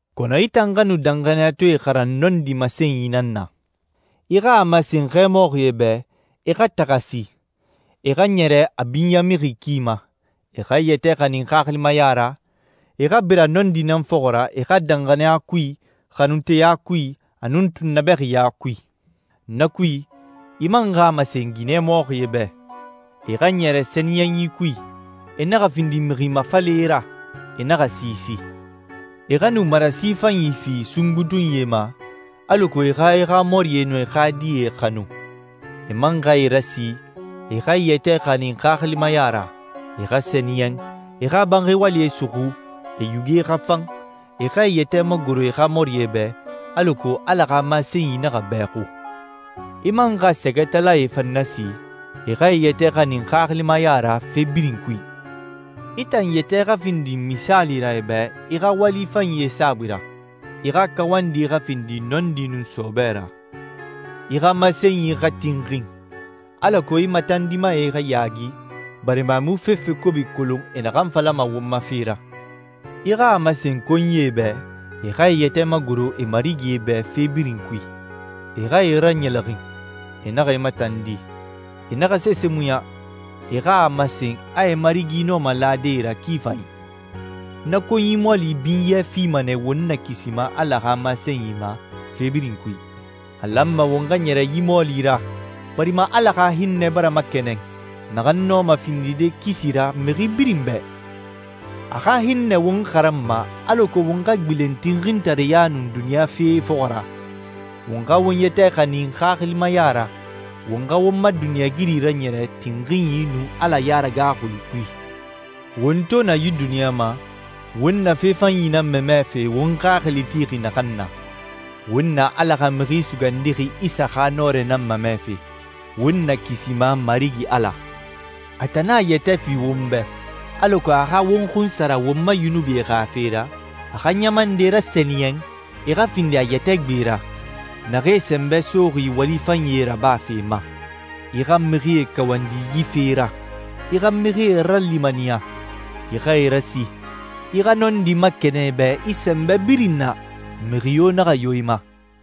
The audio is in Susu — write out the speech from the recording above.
Kɔnɔ i tan xa nu danxaniyatɔɛe xaran nɔndi masenyi nan na. I xa a masen xɛmɔxie bɛ e xa taxasi, e xa ɲɛrɛ a binyamixi ki ma, e xa e yɛtɛ xanin xaxilimaya ra, e xa bira nɔndi nan fɔxɔ ra e xa danxaniya kui, xanunteya kui, a nun tunnabɛxiya kui. Na kui, i man xa a masen ginɛ mɔxie bɛ, e xa ɲɛrɛ sɛniyɛnyi kui, e naxa findi mixi mafalɛe ra, e naxa siisi. E xa nu marasi fanyi fi sungbutunyie ma alako e xa e xa mɔrie nun e xa die xanu. E man xa e rasi e xa e yɛtɛ xanin xaxilimaya ra, e xa sɛniyɛn, e xa banxi walie suxu, e yuge xa fan, e xa e yɛtɛ magoro e xa mɔrie bɛ, alako Ala xa masenyi naxa bɛxu. I man xa sɛgɛtalae fan nasi e xa e yɛtɛ xanin xaxilimaya ra fe birin kui. I tan yɛtɛ xa findi misaali ra e bɛ i xa wali fanyie saabui ra. I xa kawandi xa findi nɔndi nun sɔɔbɛ ra. I xa masenyi xa tinxin, alako i matandimae xa yaagi, barima e mu fefe kobi kolon e naxan falama won ma fe ra. I xa a masen konyie bɛ, e xa e yɛtɛ magoro e marigie bɛ fe birin kui. E xa e raɲɛlɛxin, e naxa e matandi, e naxa sese muɲa, e xa a masen a e marigie nɔma lade e ra ki fanyi. Na konyi mɔɔli binyɛ fima nɛ won Nakisima Ala xa masenyi ma fe birin kui. A lanma won xa ɲɛrɛ yi mɔɔli ra barima Ala xa hinnɛ bara makɛnɛn, naxan nɔma findide kisi ra mixi birin bɛ. A xa hinnɛ won xaranma alako won xa gbilen tinxintareya nun duniɲa fee fɔxɔ ra, won xa won yɛtɛ xanin xaxilimaya ra, won xa won ma duniɲɛigiri raɲɛrɛ tinxinyi nun Ala yaragaaxui kui. Won to na yi duniɲa ma, won na fe fanyi nan mamɛfe won xaxili tixi naxan na. Won na Ala xa Mixi Sugandixi Isa xa nɔrɛ nan mamɛfe, won Nakisima Marigi Ala. A tan nan a yɛtɛ fi won bɛ, alako a xa won xunsara won ma yunubie xa fe ra, a xa ɲama nde rasɛniyɛn e xa findi a yɛtɛ gbe ra, naxee sɛnbɛ soxi wali fanyie rabafe ma. I xa mixie kawandi yi fee ra. I xa mixie ralimaniya. I xa e rasi. I xa nɔndi makɛnɛn e bɛ i sɛnbɛ birin na. Mixi yo naxa yo i ma.